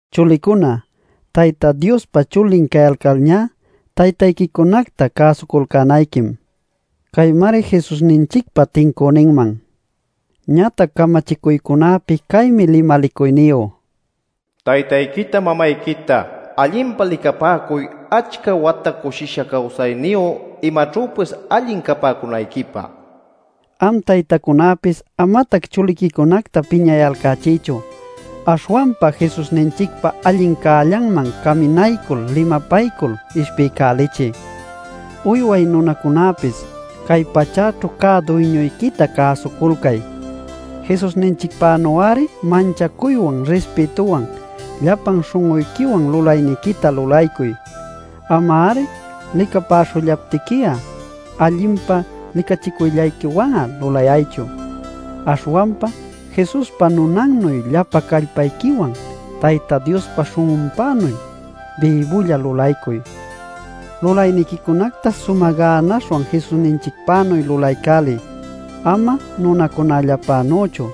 Chulicuna, Tayta Diospa chulin cayalcalñá taytayquicunacta cäsuculcänayquim. Caymari Jesusninchicpa tincüninman. Ñatac camachicuycunapi caymi limalicuyniyu: “Taytayquita mamayquita allinpa licapäcuy achca wata cushisha cawsayniyu imaćhüpis allin capäcunayquipä” nil. Am taytacunäpis amatac chuliquicunacta piñayalcächiychu. Aśhwanpa Jesusninchicpa allin cällanman caminaycul limapaycul ishpiycälichiy. Uyway nunacunäpis cay pachäćhu cä duyñuyquita cäsuculcay. Jesusninchicpänu-ari manchacuywan rispïtuwan llapan śhun'uyquiwan lulayniquita lulaycuy. Ama-ari licapäśhullaptiqui'a allinpa licachicuyllayquiwan'a lulayaychu, aśhwanpa Jesuspa nunannuy llapan callpayquiwan Tayta Diospa śhun'unpänuy bïbulla lulaycuy. Lulayniquicunacta sumä gänaśhwan Jesusninchicpänuy lulaycäliy, ama nunacunallapänüchu.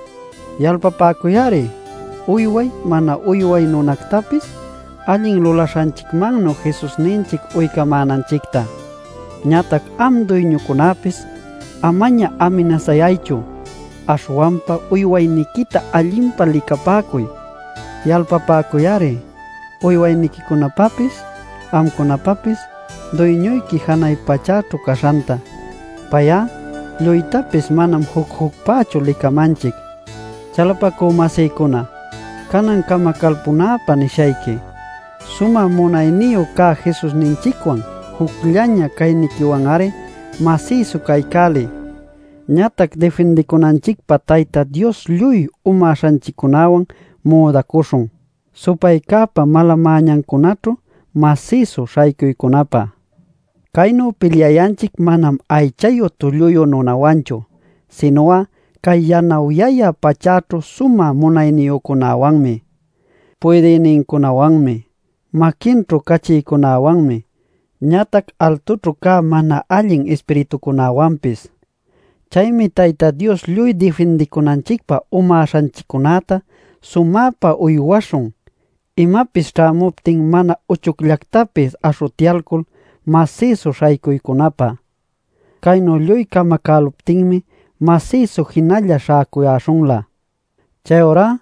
Yalpapäcuy-ari uyway, mana uyway nunactapis allin lulaśhanchicmannu Jesusninchic uycamänanchicta. Ñatac am duyñucunapis amaña aminasayaychu, aśhwanpa uywayniquita allinpa licapäcuy. Yalpapäcuy-ari, uywayniquicunapapis amcunapapis Duyñuyqui janay pachächu caśhanta. Pay'a lluytapis manam juc-jucpächu licamanchic. Chalapacü-masïcuna, canan camacalpunäpä nishayqui: sumä munayniyu cä Jesusninchicwan jucllaña cayniquiwan-ari masïsu caycäliy. Ñatac difindicunanchicpä Tayta Dios lluy umäśhanchiccunäwan müdacuśhun, supaycäpa mala-mäñancunaćhu masïsu śhaycuycunapä. Caynu pilyayanchic manam aychayu tulluyu nunawanchu, sinu'a cay yanawyayä pachäćhu sumä munayniyücunäwanmi, puydïnincunawanmi, maquinchu cachïcunawanmi, ñatac altućhu cä mana allin ispiritucunawanpis. Chaymi Tayta Dios lluy difindicunanchicpä umäśhanchiccunäta sumäpa uywaśhun imapis ćhämuptin mana uchucllactapis aśhutyalcul masïsu śhaycuycunapä. Caynu lluy camacäluptinmi masïsu jinalla śhäcuyäśhunlä. Chayurá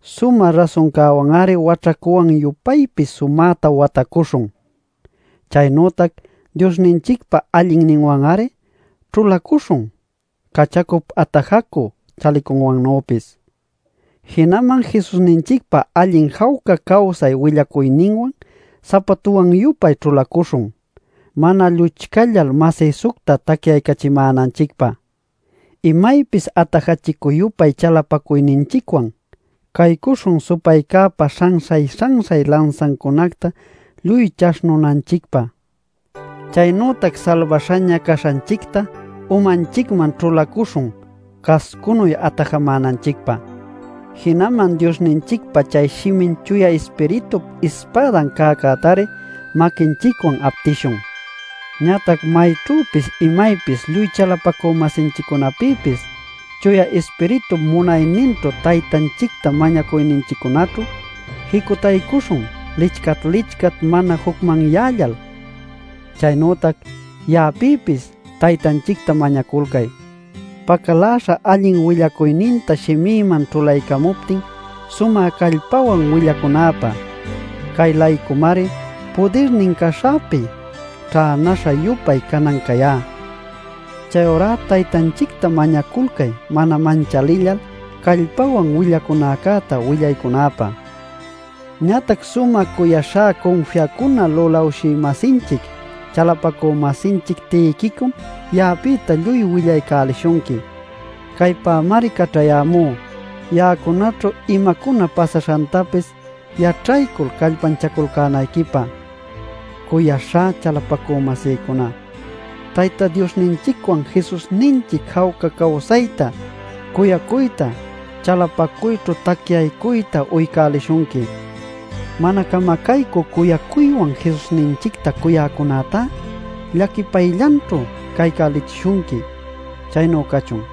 sumä rasuncäwan-ari waćhacuwan-yupaypis sumäta watacuśhun. Chaynütac Diosninchicpa allinninwan-ari ćhulacuśhun cachacup atajacü chalicunwannüpis. Jinaman Jesusninchicpa allin jawca cawsay willacuyninwan sapatuwan-yupay ćhulacuśhun mana lluchcallal masïsucta tacyaycachimänanchicpä. Imaypis atajachicü-yupay chalapacuyninchicwan caycuśhun supaycäpa śhanśhay-śhanśhay lansancunacta lluy chaśhnunanchicpä. Chaynütac salbaśhaña caśhanchicta umanchicman ćhulacuśhun cascunuy atajamänanchicpä. Jinaman Diosninchicpa chay shimin Chuya Ispiritup ispädan cäcätari maquinchicwan aptishun. Ñatac mayćhüpis imaypis lluy chalapacü-masinchiccunapïpis Chuya Ispiritup munayninćhu Taytanchicta mañacuyninchiccunaćhu jicutaycuśhun lichcat-lichcat mana jucmanyällal. Chaynütac ya'apïpis Taytanchicta mañaculcay, pacaläśha allin willacuyninta shimïman ćhulaycamuptin sumä callpawan willaycunäpä. Cay-laycumari pudirnin caśhäpi ćhänäśha-yupay canan cayá. Chayurá Taytanchicta mañaculcay mana manchalillal callpawan willacunäcäta willaycunäpä. Ñatac sumä cuyaśhá cunfiacuna lulawshï-masinchic chalapacü-masinchic Tiquicom ya'apïta lluy willaycälishunqui. Caypämari caćhayämú, ya'acunaćhu imacuna pasaśhantapis yaćhaycul callpanchaculcänayquipä. Cuyaśhá chalapacü-masïcuna, Tayta Diosninchicwan Jesusninchic jawca cawsayta, cuyacuyta, chalapacuyćhu tacyaycuyta uycälishunqui. Mana camacaycü cuyacuywan Jesusninchicta cuyäcunätá llaquipayllanćhu caycälichishunqui. Chaynu cachun.